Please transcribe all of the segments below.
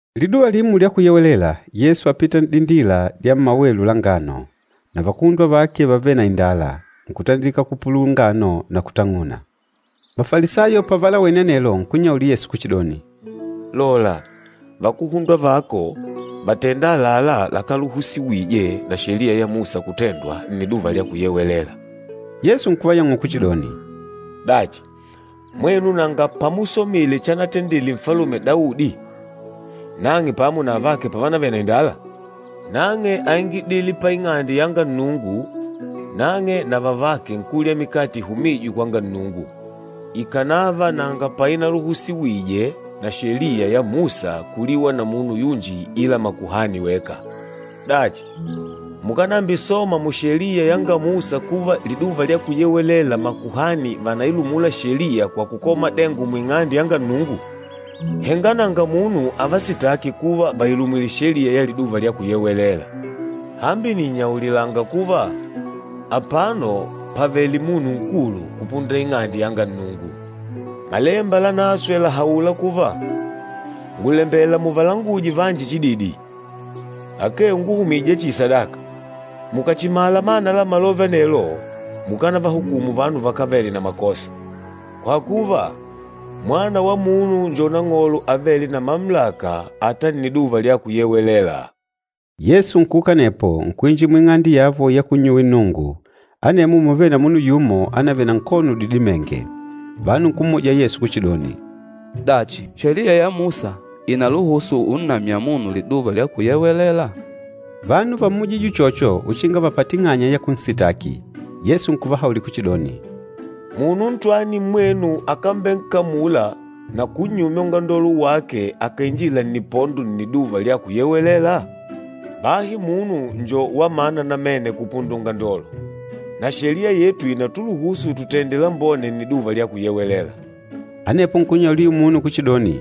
Liduva limo lya Kuyewelela, Yesu ápita n'dindila dya mmawelu la ngano. Na vakuhundwa vake vávele na indala, nkutandilika kupulula ngano na kutang'una. Mafalisayo pavalawene anelo, nkunnyaulila Yesu kuchidoni, “Lola, vakuhundwa vako vàtenda àlalá lakáluhusiwije na Sheliya ya Musa kutendwa Nniduva lya Kuyewelela.” Yesu nkuvayang'ula kuchidoni, “Dachi, mwenu nanga pamusomile chanatendile Nfalume Daudi nang'e pamo na vavake pavanavele na indala? Nang'e áingidile pa Ing'ande yanga Nnungu. Nang'e na vavake nkulya mikate ihumîjwe kwanga Nnungu, ikanava nanga painaluhusiwije na Sheliya ya Musa kuliwa na munu yunji ila makuhani weka. Dachi, mukánambisoma mu Sheliya yanga Musa kuva Liduva lya Kuyewelela makuhani vànailumula Sheliya kwa kukola madengo mu Ing'ande yanga Nnungu? Henga nanga munu avasitâki kuva vàilumwile sheliya ya Liduva lya Kuyewelela. Hambi nìnnyaulila kuva, apano pàvele munu nkulu kupunda Ing'ande yanga Nnungu. Malemba Lanaswe làhaula kuva, ‘Ngùlembela muvalanguje vanji chididi, akee unguhumija chihi sadaka.’ Mukàchimala mana la malove anelo, mukánavahukumu vanu vakávele na makosa. Kwa kuva, Mwana wa Munu njo Nang'olo avêle na mamulaka ata Nniduva lya Kuyewelela.” Yesu nkuuka anepo, nkuinjila muing'ande yavo ya kunnyuwila Nnungu, anemwo múvele na munu yumo ánavele na nkono udidimenge. Vanu nkummuja Yesu kuchidoni, “Dachi, Sheliya ya Musa ìnaluhusu unnamya munu Liduva lya Kuyewelela?” Vanu vámmujije uchocho uchinga vapate ing'anya ya kunsitaki. Yesu nkuvahaulila kuchidoni, “Munu ntwani mmwenu akámbenkamula na kunnyumya ungandolo wake, akàinjila nnipondo, Nniduva lya Kuyewelela?” Bahi munu njo wa mana namene kupunda ungandolo! Na Sheliya yetu ìnatuluhusu tutende lambone Nniduva lya Kuyewelela. Anepo nkunnyaulila ayula munu kuchidoni,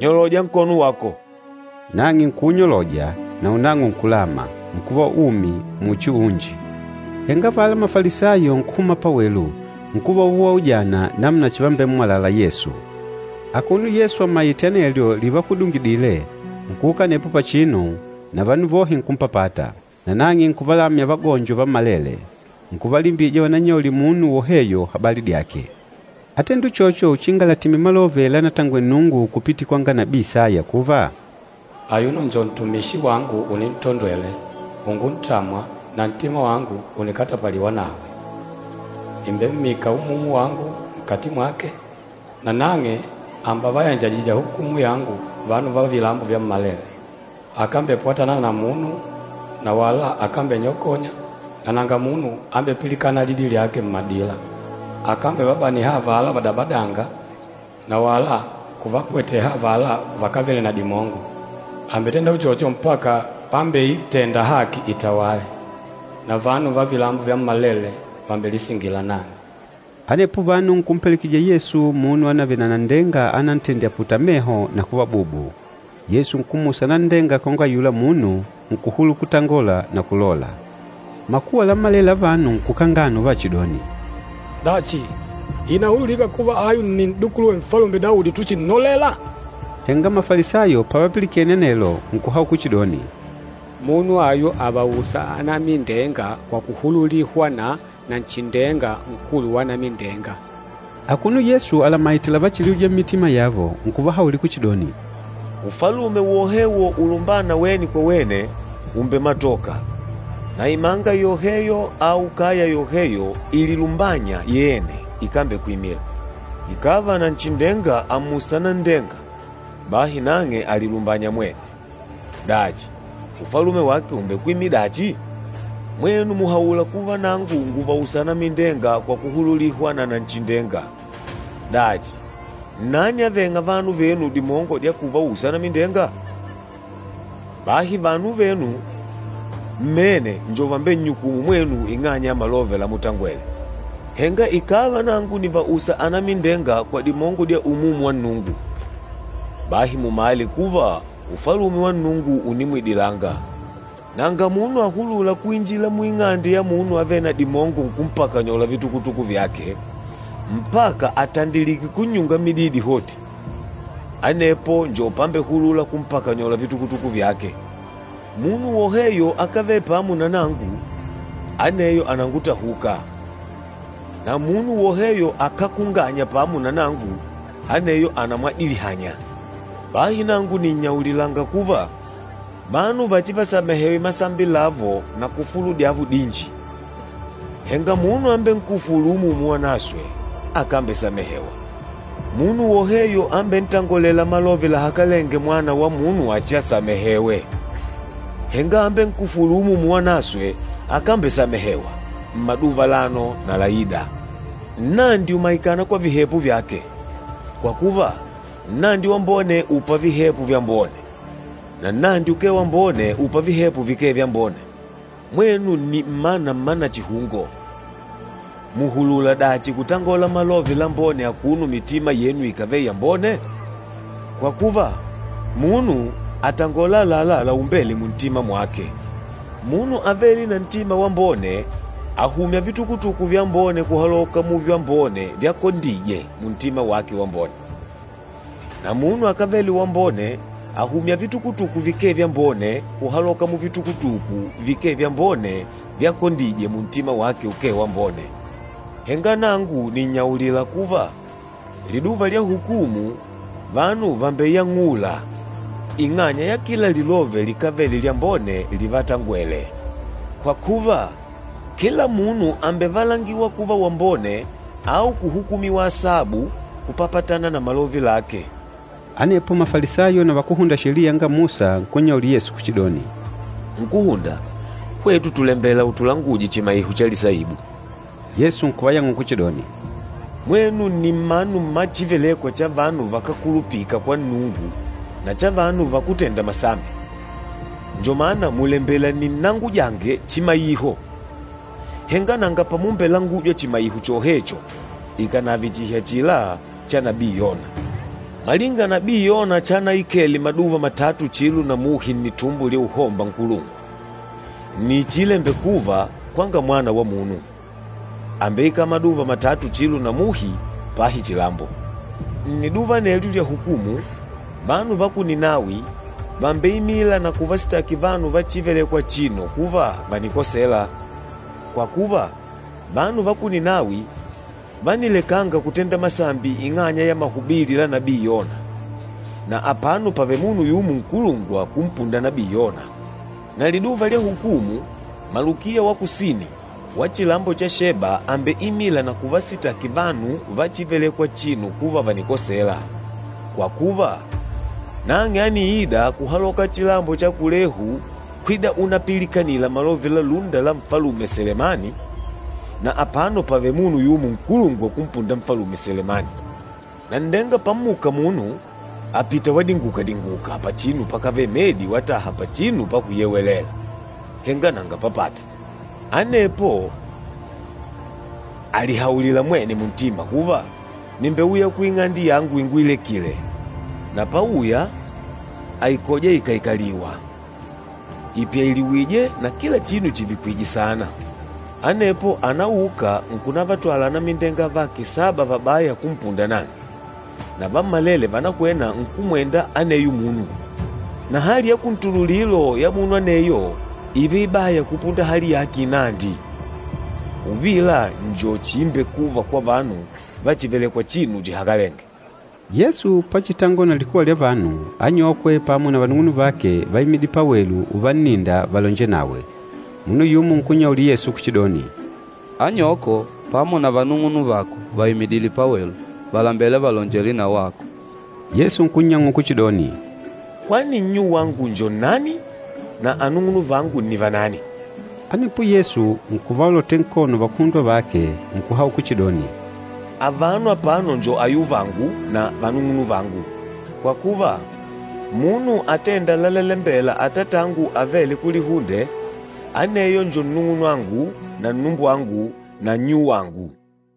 “Nyoloja nkono wako.” Nang'e nkuunyoloja, naunang'o nkulama, nkuva umi muchi unji. Henga avala Mafalisayo nkuhuma pawelu, nkuva uvaujana namuna chivambemmwalala Yesu. Akuno Yesu amaîte anelyo livakudungidile, nkuuka anepo pachinu, na vanu vohe nkumpapata. Na nang'e nkuvalamya vagonjo vammalele. Nkuvalimbija vanannyaulile munu woheyo habali dyake. Átendile uchocho uchinga latimile malove lanatangwele Nnungu kupitila kwanga nabii Isaya kuva, “Ayuno njo ntumishi wangu unintondwele, unguntamwa, na ntima wangu unikatapaliwa nawe. Nìmbemmika Umumu wangu nkati mwake, nanang'e àmbevayanjajija hukumu yangu vanu va vilambo vyammalele. Akámbepwatana na munu, na wala akámbenyokonya, na nanga munu ambepilikâna lidi lyake mmadila. Akámbevabaniha avala vadabadânga, na wala kuvapweteha avala vakávele na dimongo, àmbetenda uchocho mpaka pámbeitenda haki itawale. Na vanu va vilambo vyammalele vàmbelisingila nang'e.” Anepo vanu nkumpelekejija Yesu munu anavele na nanndenga anantendile aputale meho na kuva bubu. Yesu nkummusa nanndenga kwanga ayula munu, nkuhulula kutangola na kulola. Makuwa lammalele la vanu nkukangana uvachidoni, “Dachi, ìnahululika kuva ayu nni N'dukuluwe Nfalume Daudi, utuchinnolela?” Henga Mafalisayo pavapilikene anelo, nkuhaula kuchidoni, “Munu ayu àvausa anamindenga kwa kuhululihwa na Nanchindenga, nkulu wa anamindenga.” Akuno Yesu alamaite lavachiliuja mmitima yavo, nkuvahaulila kuchidoni, “Ufalume wohewo ulumbâna wene kwa wene, ùmbematoka, na imanga yoheyo au kaya yoheyo ililumbânya yene ikambekwimila. Ikàva Nanchindenga àmmusa nanndenga, bahi nang'e àlilumbanya mwene. Dachi, ufalume wake ùmbekwimila dachi? Mwenu mùhaula kuva nangu ngùvausa anamindenga kwa kuhululihwa na Nanchindenga, dachi, nnani avêng'a vanu venu dimongo dya kuvausa anamindenga? Bahi vanu venu mmene njo vambennyukûmu mwenu ing'anya ya malove lamutangwele. Henga ikàva nangu nìvausa anamindenga kwa dimongo dya Umumu wa Nnungu, bahi mumale kuva Ufalume wa Nnungu ùnimwidilanga. Nanga munu ahulûla kuinjila muing'ande ya munu avêle na dimongo nkumpakanyola vitukutuku vyake, mpaka àtandilike kunnyunga mididi hoti. Anepo njo pambehulula kumpakanyola vitukutuku vyake. Munu woheyo akávele pamo na nangu, aneyo ànangutahuka, na munu woheyo akákunganya pamo na nangu, aneyo ànamwadilihanya. Bahi nangu nìnnyaulilanga kuva, vanu vachivasamehewe masambi lavo na kufulu dyavo dinji, henga munu ambenkufûlu Umumu Wanaswe, akambesamehewa. Munu woheyo ambentangolêla malove lahakalenge Mwana wa Munu achiasamehewe, henga ambenkufûlu Umumu Wanaswe akambesamehewa, mmaduva alano na laida.” “Nnandi ùmaikana kwa vihepo vyake. Kwa kuva, nnandi wambone ùpa vihepo vyambone, na nnandi ukee wambone ùpa vihepo vikee vyambone. Mwenu nni mmana mma nachihungo! Mùhulula dachi kutangola malove lambone akuno mitima yenu ikávele yambone? Kwa kuva, munu àtongola àlalá laumbêle muntima mwake. Munu avêle na ntima wambone àhumya vitukutuku vyambone kuhaloka muvyambone vyakondije muntima wake wambone, na munu akávele wambone àhumya vitukutuku vikee vyambone kuhaloka muvitukutuku vikee vyambone vyakondije muntima wake ukee wambone. Henga nangu nìnnyaulila kuva, liduva lya hukumu, vanu vàmbeyang'ula ing'anya ya kila lilove likávele lyambone livatangwele. Kwa kuva, kila munu àmbevalangiwa kuva wambone au kuhukumiwa asabu kupapatana na malove lake.” Anepo Mafalisayo na vakúhunda Sheliya yanga Musa nkunnyaulila Yesu kuchidoni, “Nkúhunda, hwetu tùlembela utulanguje chimaiho cha lisaibu.” Yesu nkuvayang'ula kuchidoni, “Mwenu nni mmanu mma chívelèkwà cha vanu vakákulupika kwa Nnungu na cha vanu vakútenda masambi, njo mana mùlembela ninnangujange chimaiho, henga nanga pamumbelangujwa chimaiho chohecho ikànave chihi achila cha nabii Yona. Malinga nabii Yona chanaikele maduva matatu chilo na muhi nnitumbo lya uhomba nkulungwa, nni chiilembekuva kwanga Mwana wa Munu, àmbeikala maduva matatu chilo na muhi, pahi chilambo. Nniduva anelyo lya hukumu, vanu va ku Ninawi vàmbeimila na kuvasitaki vanu va chívelèkwà achino kuva vànikosela. Kwa kuva, vanu va ku Ninawi vánilekanga kutenda masambi ing'anya ya mahubili la nabii Yona, na apano pàvele munu yumo nkulungwa kumpunda nabii Yona! Na liduva lya hukumu, malukiya wa kusini, wa chilambo cha Sheba àmbeimila na kuvasitaki vanu va chívelèkwà achino kuva vànikosela. Kwa kuva, nang'e ániida kuhaloka chilambo cha kulehu kwida unapilikanila malove la lúnda la Nfalume Selemani, na apano pàvele munu yumo nkulungwa kumpunda Nfalume Selemani.” “Nanndenga pammuka munu, àpita wadinguka-dinguka pachinu pakávele medi wataha pachinu pakuyewelela, henga nanga papata. Anepo àlihaulila mwene muntima kuva, ‘Nìmbeuya kuing'ande yangu inguilekile.’ Na páùyà, àikoja ikaikalìwà, ipyailiwìjè na kila chinu chivikwìjè saana. Anepo ànauka nkunavatwala anamindenga avake saba vabaya kumpunda nang'e, na vammalele vànahwena nkumwenda aneyo munu. Na hali ya kuntululilo ya munu aneyo ììva ibaya kupunda hali yake inandi. Uvila njo chiimbekuva kwa vanu vachívelèkwà achino chihakalenge.” Yesu pachitangola na likuwa lya vanu, anyokwe pamo na vanung'unuvake váimidile pawelu uvanninda valonjele nawe. Munu yumo nkunnyaulila Yesu kuchidoni, “Anyoko pamo na vanung'unuvako vàimidile pawelu, vàlembela valonjele na wako.” Yesu nkunnyang'ula kuchidoni, “Kwani nnyuwangu njo nnani na anung'unuvangu ni vanani?” Anepo Yesu nkuvaolotela nkono vakuhundwa vake, nkuhaula kuchidoni, “Avano apano njo ayuvangu na vanung'unuvangu! Kwa kuva, munu atênda lalalembela Atatangu avêle kulihunde, aneyo njo nnung'unwangu na nnumbwangu na nnyuwangu.”